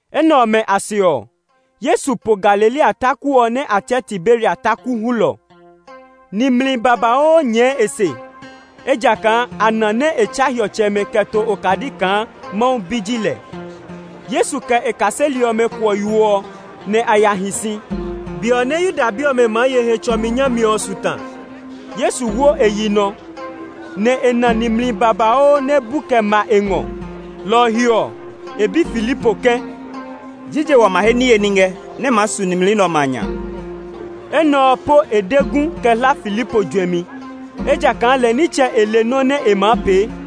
Enɛ ɔmɛ a se ɔ, Yesu po Galilea taku ɔ nɛ a tsɛɛ Tiberia taku hulɔ ɔ. Nimli babauu nyɛɛ e se, ejakaa a na nɛ e tsa hiɔtsɛmɛ kɛ to okadi kaa Mawu Bi ji lɛ. Yesu kɛ e kaseli ɔmɛ kuɔ yo ɔ, nɛ a ya hi si. Be nɛ Yuda bi ɔmɛ maa ye Hetsɔmi nyami ɔ su ta. Yesu wo e yi nɔ, nɛ e na nimli babauu nɛ bu kɛ ma e ngɔ. Lɔ ɔ he ɔ, e bi Filipo ke, “Jije wa ma he niye ní ngɛ nɛ maa su nimli nɛ ɔmɛ a nya?” (Enɛ ɔ po e de gu kɛ hla Filipo juɛmi, ejakaa lɛ nitsɛ e le nɔ́ nɛ e maa pee.)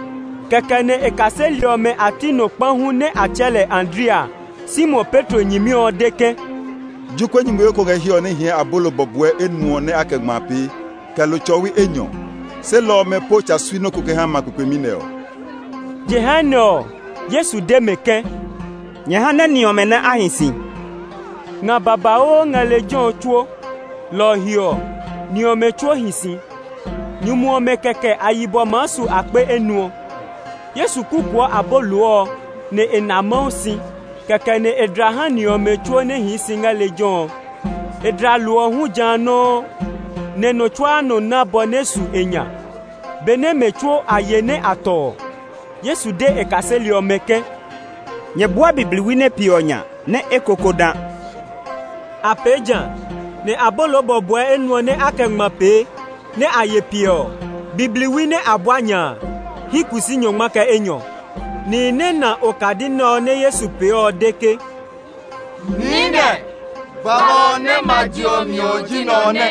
Kɛkɛ nɛ e kaseli ɔmɛ a ti nɔ kpa hu nɛ a tsɛɛ lɛ Andrea, Simon Petro nyɛmi ɔ de ke, “Jokuɛ nyumuyo ko ngɛ hiɛ ɔ nɛ hɛɛ abolo bɔbɔɛ enuɔ nɛ a kɛ ngma pee, kɛ lo tsɔwi enyɔ, se lɔ ɔmɛ po tsa sui nɔ́ ko kɛ ha ma kpekpemi nɛ ɔ.” Jehanɛ ɔ, Yesu de mɛ ke, “Nyɛ ha nɛ ni ɔmɛ nɛ a hi si.” Nga babauu ngɛ lejɛ ɔ tsuo. Lɔ ɔ he ɔ, ni ɔmɛ tsuo hi si. Nyumu ɔmɛ kɛkɛ a yibɔ maa su akpe enuɔ. Yesu kukuɔ abolo ɔ, nɛ e na Mawu si; kɛkɛ nɛ e dla ha ni ɔmɛ tsuo nɛ hii si ngɛ lejɛ ɔ. E dla lo ɔ hu ja nɔuu, nɛ nɔ tsuaa nɔ ná bɔ nɛ maa su e nya. Benɛ mɛ tsuo a ye nɛ a tɔ ɔ, Yesu de kaseli ɔmɛ ke, “Nyɛ bua bibliwi nɛ piɛ ɔ nya nɛ eko kó dã.” A pee jã, nɛ abolo bɔbɔɛ enuɔ nɛ a kɛ ngma pee, nɛ a ye piɛ ɔ, bibliwi nɛ a bua nya a hyi kusii nyɔngma kɛ enyɔ. Nihi nɛ na okadi nɛ ɔ nɛ Yesu pee ɔ de ke, “Niinɛ, gbalɔ ɔ nɛ ma je ɔ mi ɔ ji nɛ ɔ nɛ.”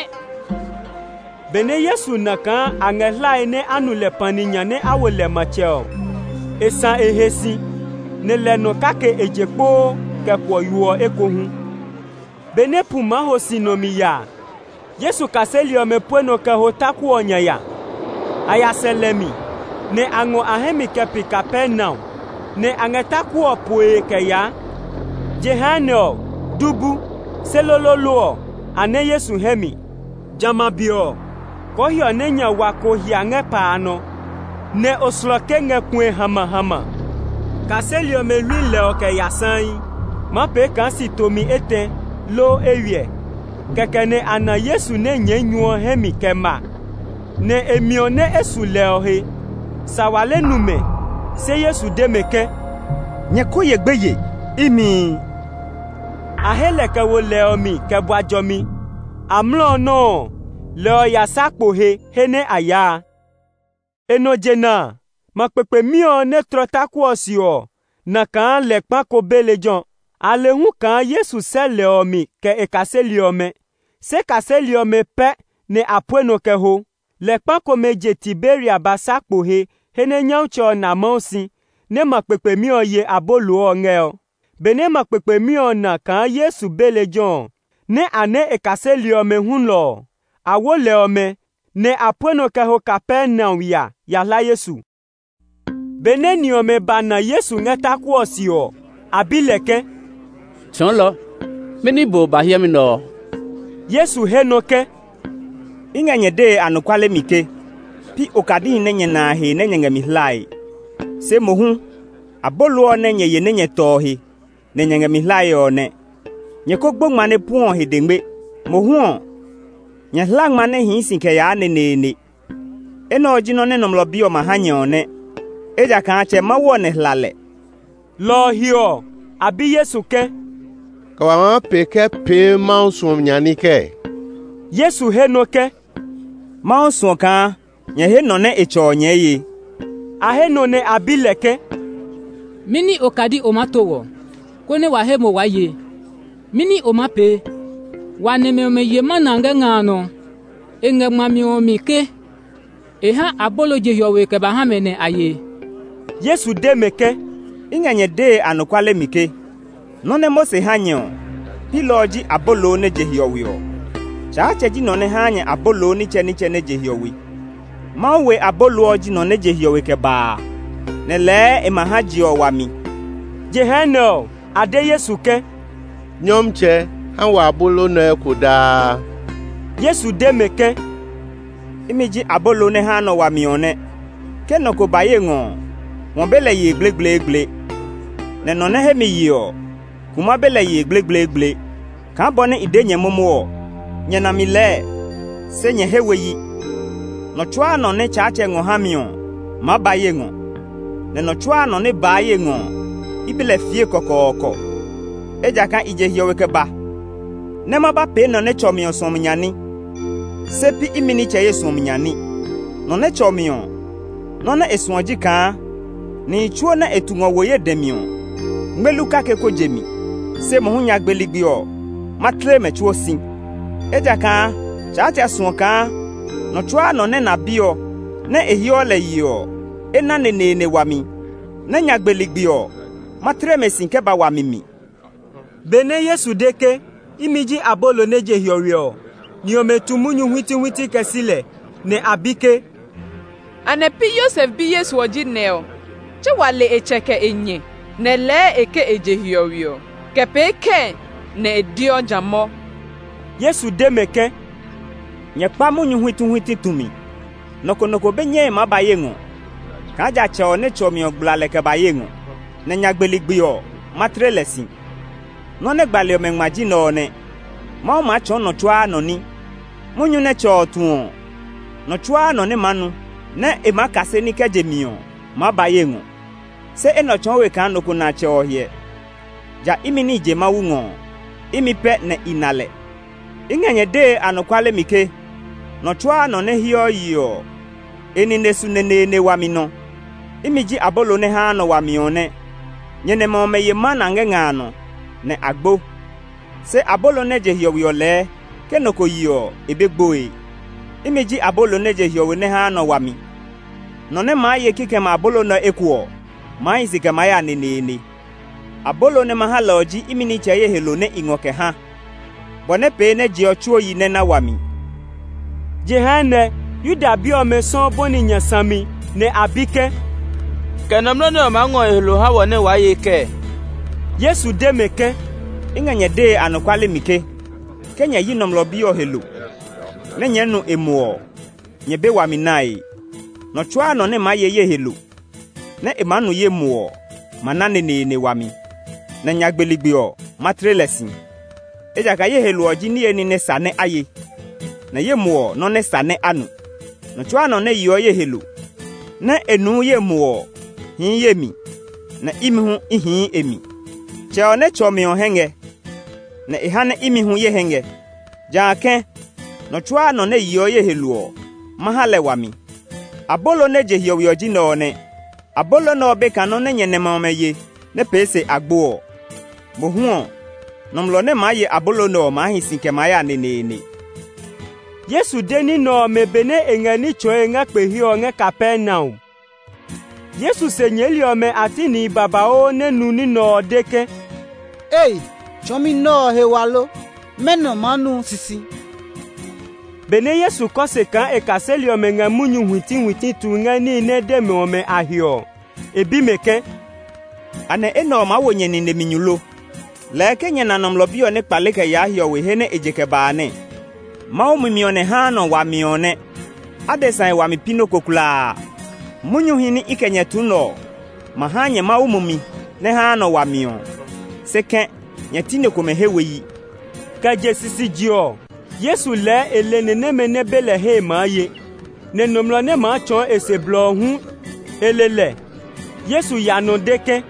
Benɛ Yesu na kaa a ngɛ hlae nɛ a nu lɛ pani nya, nɛ a wo lɛ matsɛ ɔ, e sã e he si, nɛ lɛ nɔ kake e je kpoo kɛ kuɔ yo ɔ ekohu. Benɛ pu maa ho si nɔmi ya a, Yesu kaseli ɔmɛ pue nɔ kɛ ho taku ɔ nya ya. A ya sɛ lɛ mi, nɛ a ngɔ a hɛ mi kɛ pi Kapernaum, nɛ a ngɛ taku ɔ poe kɛ yaa. Jehanɛ ɔ du bu, se loloolo ɔ, a nɛ Yesu hɛ mi. Jamɛ a be ɔ, kɔɔhiɔ nɛ nya wa ko hia ngɛ pa a nɔ, nɛ oslɔke ngɛ kue hamahama. Kaseli ɔmɛ hlui lɛ ɔ kɛ ya saii, maa pee kaa si tomi etɛ, loo eywiɛ; kɛkɛ nɛ a na Yesu nɛ nyɛɛ nyu ɔ hɛ mi kɛ ma, nɛ e miɔ nɛ e su lɛ ɔ he. Sawale nu mɛ, se Yesu de mɛ ke, “Nyɛ ko ye gbeye! Imi!” A he lɛ kɛ wo lɛ ɔ mi kɛ bua jɔmi; amlɔ ɔ nɔuu ɔ, lɛ ɔ ya sa kpo he he nɛ a yaa a. E nɔ jena a, ma kpekpemi ɔ nɛ tlɔ taku ɔ se ɔ na kaa lɛ kpa ko be lejɛ ɔ. A le hu kaa Yesu sɛ́ lɛ ɔ mi kɛ kaseli ɔmɛ, se kaseli ɔmɛ pɛ nɛ a pue nɔ kɛ ho. Lɛ kpa komɛ je Tiberia ba sa kpo he he nɛ Nyɔmtsɛ ɔ na Mawu si, nɛ ma kpekpemi ɔ ye abolo ɔ ngɛ ɔ. Benɛ ma kpekpemi ɔ na kaa Yesu be lejɛ ɔ, nɛ a nɛ́ e kaseli ɔmɛ hulɔ ɔ, a wo lɛ ɔmɛ, nɛ a pue nɔ kɛ ho Kapernaum ya ya hla Yesu. Benɛ ni ɔmɛ ba na Yesu ngɛ taku ɔ se ɔ, a bi lɛ ke, “Tsɔɔlɔ, mɛni be o ba hiɛmɛ nɛ ɔ?” Yesu he nɔ ke, “I ngɛ nyɛ dee anɔkuale mi ke, pi okadihi nɛ nyɛ na a a he nɛ nyɛ ngɛ mi hlae; se mohu abolo ɔ nɛ nyɛ ye nɛ nyɛ tɔ ɔ he nɛ nyɛ ngɛ mi hlae ɔ nɛ. Nyɛ ko gbo ngma nɛ puɛɔ ɔ he dengme. Mohu ɔ, nyɛ hla ngma nɛ hii si kɛ yaa neneene. Enɛ ɔ ji nɔ́ nɛ Nɔmlɔ Bi ɔ ma ha nyɛ ɔ nɛ, ejakaa Tsɛ Mawu ɔ nɛ hla lɛ.” Lɔ ɔ he ɔ, a bi Yesu ke, “Kɛ wa maa pee kɛ pee Mawu suɔmi nya ní kɛɛ?” Yesu he nɔ́ ke, “Mawu suɔ kaa nyɛ he nɔ nɛ e tsɔ ɔ nyɛɛ ye.” A he nɔ nɛ a bi lɛ ke, “Mɛni okadi o maa to wɔ, konɛ wa he mo waa ye? Mɛni o maa pee? Wa nɛmɛ ɔmɛ ye mana ngɛ nga a nɔ. E ngɛ ngmami ɔmɛ a mi ke, ‘E ha abolo je hiɔwe kɛ ba ha mɛ nɛ a ye.’” Yesu de mɛ ke, “I ngɛ nyɛ dee anɔkuale mi ke nɔ́ nɛ Mose ha nyɛ ɔ, pi lɔ ɔ ji abolo nɛ je hiɔwe ɔ. Tsaatsɛ ji nɔ nɛ haa nyɛ abolo nitsɛnitsɛ nɛ je hiɔwe. Mawu we abolo ɔ ji nɔ nɛ je hiɔwe kɛ ba a, nɛ lɛɛ e ma ha je ɔ wami.” Jehanɛ ɔ, a de Yesu ke, “Nyɔmtsɛ, ha wɔ abolo nɛ ɔ eko daa.” Yesu de mɛ ke, “Imi ji abolo nɛ haa nɔ wami ɔ nɛ. Ke nɔ ko ba ye ngɔ ɔ, hwɔ be lɛ yee gblegbleegble; nɛ nɔ nɛ he mi ye ɔ, kuma be lɛ yee gblegbleegble. Kaa bɔ nɛ i de nyɛ momo ɔ, nyɛ na mi lɛɛ, se nyɛ he we yi. Nɔ tsuaa nɔ nɛ Tsaatsɛ ngɔ ha mi ɔ maa ba ye ngɔ. Nɔ tsuaa nɔ nɛ baa ye ngɔ ɔ, i be lɛ fiee kɔkɔɔkɔ. Ejakaa i je hiɔwe kɛ ba nɛ ma ba pee nɔ nɛ tsɔ mi ɔ suɔmi nya ní, se pi imi nitsɛ ye suɔmi nya ní. Nɔ nɛ tsɔ mi ɔ, nɔ́ nɛ e suɔ ji kaa nihi tsuo nɛ e tu ngɔ wo ye dɛ mi ɔ, ngmelu kake kó je mi; se mohu nyagbe ligbi ɔ, ma tle mɛ tsuo si. Ejakaa Tsaatsɛ suɔ kaa nɔ tsuaa nɔ nɛ na Bi ɔ, nɛ e heɔ lɛ yeɔ ɔ, e na neneene wami. Nɛ nyagbe ligbi ɔ, ma tle mɛ si kɛ ba wami mi.” Benɛ Yesu de ke, “Imi ji abolo nɛ je hiɔwe ɔ”, ni ɔmɛ tu munyu huitihuiti kɛ si lɛ; nɛ a bi ke, “Anɛ pi Yosef bi Yesu ɔ ji nɛ ɔ? Tse wa le e tsɛ kɛ e nyɛ! Nɛ lɛɛ e ke e je hiɔwe ɔ? Kɛ pee kɛɛ nɛ e deɔ jã mɔ?” Yesu de mɛ ke, “Nyɛ kpa munyu huitihuiti tumi. Nɔ ko nɔ ko be nyɛe maa ba ye ngɔ kaa ja Tsɛ ɔ nɛ tsɔ mi ɔ gbla lɛ kɛ ba ye ngɔ; nɛ nyagbe ligbi ɔ, ma tle lɛ si. Nɔ́ nɛ gbali ɔmɛ ngma ji nɛ ɔ nɛ: ‘Mawu maa tsɔɔ nɔ tsuaa nɔ ní.’ Munyu nɛ Tsɛ ɔ tu ɔ, nɔ tsuaa nɔ nɛ maa nu, nɛ e maa kase ní kɛ je mi ɔ maa ba ye ngɔ. Se enɛ ɔ tsɔɔ we kaa nɔ ko na Tsɛ ɔ hyɛ; ja imi nɛ i je Mawu ngɔ ɔ, imi pɛ nɛ i na lɛ. I ngɛ nyɛ dee anɔkuale mi ke nɔ tsuaa nɔ nɛ heɔ yeɔ ɔ, e nine su neneene wami nɔ. Imi ji abolo nɛ haa nɔ wami ɔ nɛ. Nyɛ nɛmɛ ɔmɛ ye mana ngɛ nga a nɔ, nɛ a gbo. Se abolo nɛ je hiɔwe ɔ lɛɛ ke nɔ ko ye ɔ, e be gboe. Imi ji abolo nɛ je hiɔwe nɛ haa nɔ wami. Nɔ nɛ maa ye kikɛmɛ a abolo nɛ ɔ eko ɔ maa hi si kɛ maa ya neneene. Abolo nɛ ma ha lɛ ɔ ji imi nitsɛ ye he lo nɛ i ngɔ kɛ ha, bɔ nɛ pee nɛ je ɔ tsuo yi nɛ na wami.” Jehanɛ Yuda bi ɔmɛ sɔuu bɔni nya sami, nɛ a bi ke, “Kɛ nɔmlɔ nɛ ɔ maa ngɔ e he lo ha wɔ nɛ waa ye kɛɛ?” Yesu de mɛ ke, “I ngɛ nyɛ dee anɔkuale mi ke, ke nyɛ yi Nɔmlɔ Bi ɔ he lo, nɛ́ nyɛɛ nu e muɔ ɔ, nyɛ be wami nae. Nɔ tsuaa nɔ nɛ maa ye ye he lo, nɛ e maa nu ye muɔ ɔ ma na neneene wami; nɛ nyagbe ligbi ɔ, ma tle lɛ si. Ejakaa ye he lo ɔ ji niye ní nɛ sa nɛ a ye, nɛ ye muɔ ɔ, nɔ́ nɛ sa nɛ a nu. Nɔ tsuaa nɔ nɛ yeɔ ye he lo, nɛ e nuu ye muɔ ɔ hii ye mi, nɛ imi hu i hii e mi. Tsɛ ɔ nɛ tsɔ mi ɔ hɛ ngɛ; nɛ e ha nɛ imi hu ye hɛ ngɛ. Jã kɛ̃, nɔ tsuaa nɔ nɛ yeɔ ye he lo ɔ, ma ha lɛ wami. Abolo nɛ je hiɔwe ɔ ji nɛ ɔ nɛ. Abolo nɛ ɔ be kaa nɔ́ nɛ nyɛ nɛmɛ ɔmɛ ye nɛ pee se a gbo ɔ. Mohu ɔ, nɔmlɔ nɛ maa ye abolo nɛ ɔ maa hi si kɛ maa ya neneene.” Yesu de ní nɛ ɔmɛ benɛ e ngɛ ní tsɔɔe ngɛ kpe he ɔ ngɛ Kapernaum. Yesu se nyɛɛli ɔmɛ a ti nihi babauu nɛ nu nɔ́ nɛ ɔ, de ke, “Ei! Tsɔɔmi nɛ ɔ he wa lo! Mɛnɔ maa nu sisi.” Benɛ Yesu kɔ se kaa e kaseli ɔmɛ ngɛ munyu huitihuiti tue ngɛ níhi nɛ e de mɛ ɔ a he ɔ, e bi mɛ ke, “Anɛ enɛ ɔ maa wo nyɛ nine mi nyu lo? Ke nyɛ na Nɔmlɔ Bi ɔ nɛ kpale kɛ yaa hiɔwe he nɛ e je kɛ ba a, kɛ nyɛ maa pee kɛɛ? Mawu mumi ɔ nɛ haa nɔ wami ɔ nɛ. Adesa he wami pi nɔ́ ko kulaa. Munyuhi nɛ i kɛ nyɛ tu nɛ ɔ ma ha nyɛ Mawu mumi nɛ haa nɔ wami ɔ. Se kɛ̃, nyɛ ti ni komɛ he we yi.” (Kɛ je sisije ɔ, Yesu lɛɛ e le ni nɛmɛ nɛ be lɛ hee maa ye; nɛ nɔmlɔ nɛ maa tsɔɔ e se blɔ ɔ hu e le lɛ.) Yesu ya nɔ de ke,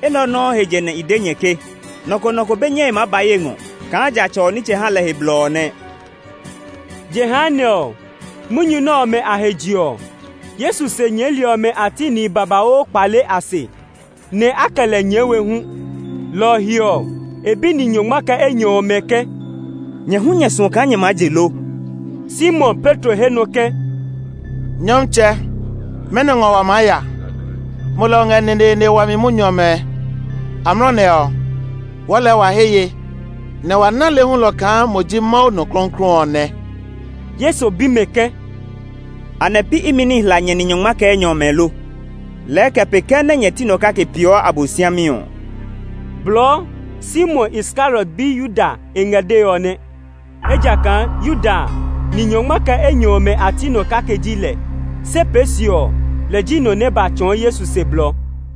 “Enɛ ɔ nɔuu he je nɛ i de nyɛ ke nɔ ko nɔ ko be nyɛe maa ba ye ngɔ kaa ja Tsɛ ɔ nitsɛ ha lɛ he blɔ ɔ nɛ.” Jehanɛ ɔ, munyu nɛ ɔmɛ a he je ɔ, Yesu se nyɛɛli ɔmɛ a ti nihi babauu kpale a se, nɛ a kɛ lɛ nyɛɛ we hu. Lɔ ɔ he ɔ, e bi ni nyɔngma kɛ enyɔ ɔmɛ ke, “Nyɛ hu nyɛ suɔ kaa nyɛɛ maa je lo?” Simon Petro he nɔ ke, “Nyɔmtsɛ, mɛnɔ ngɔ wa maa ya? Mo lɛ o ngɛ neneene wami munyu ɔmɛ. Amlɔ nɛ ɔ, wɔɔ lɛɛ wa he ye, nɛ wa na le hulɔ kaa mo ji Mawu Nɔ Klɔuklɔu ɔ nɛ.” Yesu bi mɛ ke, “Anɛ pi imi nɛ i hla nyɛ ni nyɔngma kɛ enyɔ ɔmɛ lo? Lɛ kɛ pee kɛɛ nɛ nyɛ ti nɔ kake peeɔ Abosiami ɔ?” Blɔɔ, Simon Iskariot bi Yuda e ngɛ dee ɔ nɛ. Ejakaa Yuda a, ni nyɔngma kɛ enyɔ ɔmɛ a ti nɔ kake ji lɛ. Se pee se ɔ, lɛ ji nɔ nɛ ba tsɔɔ Yesu se blɔ.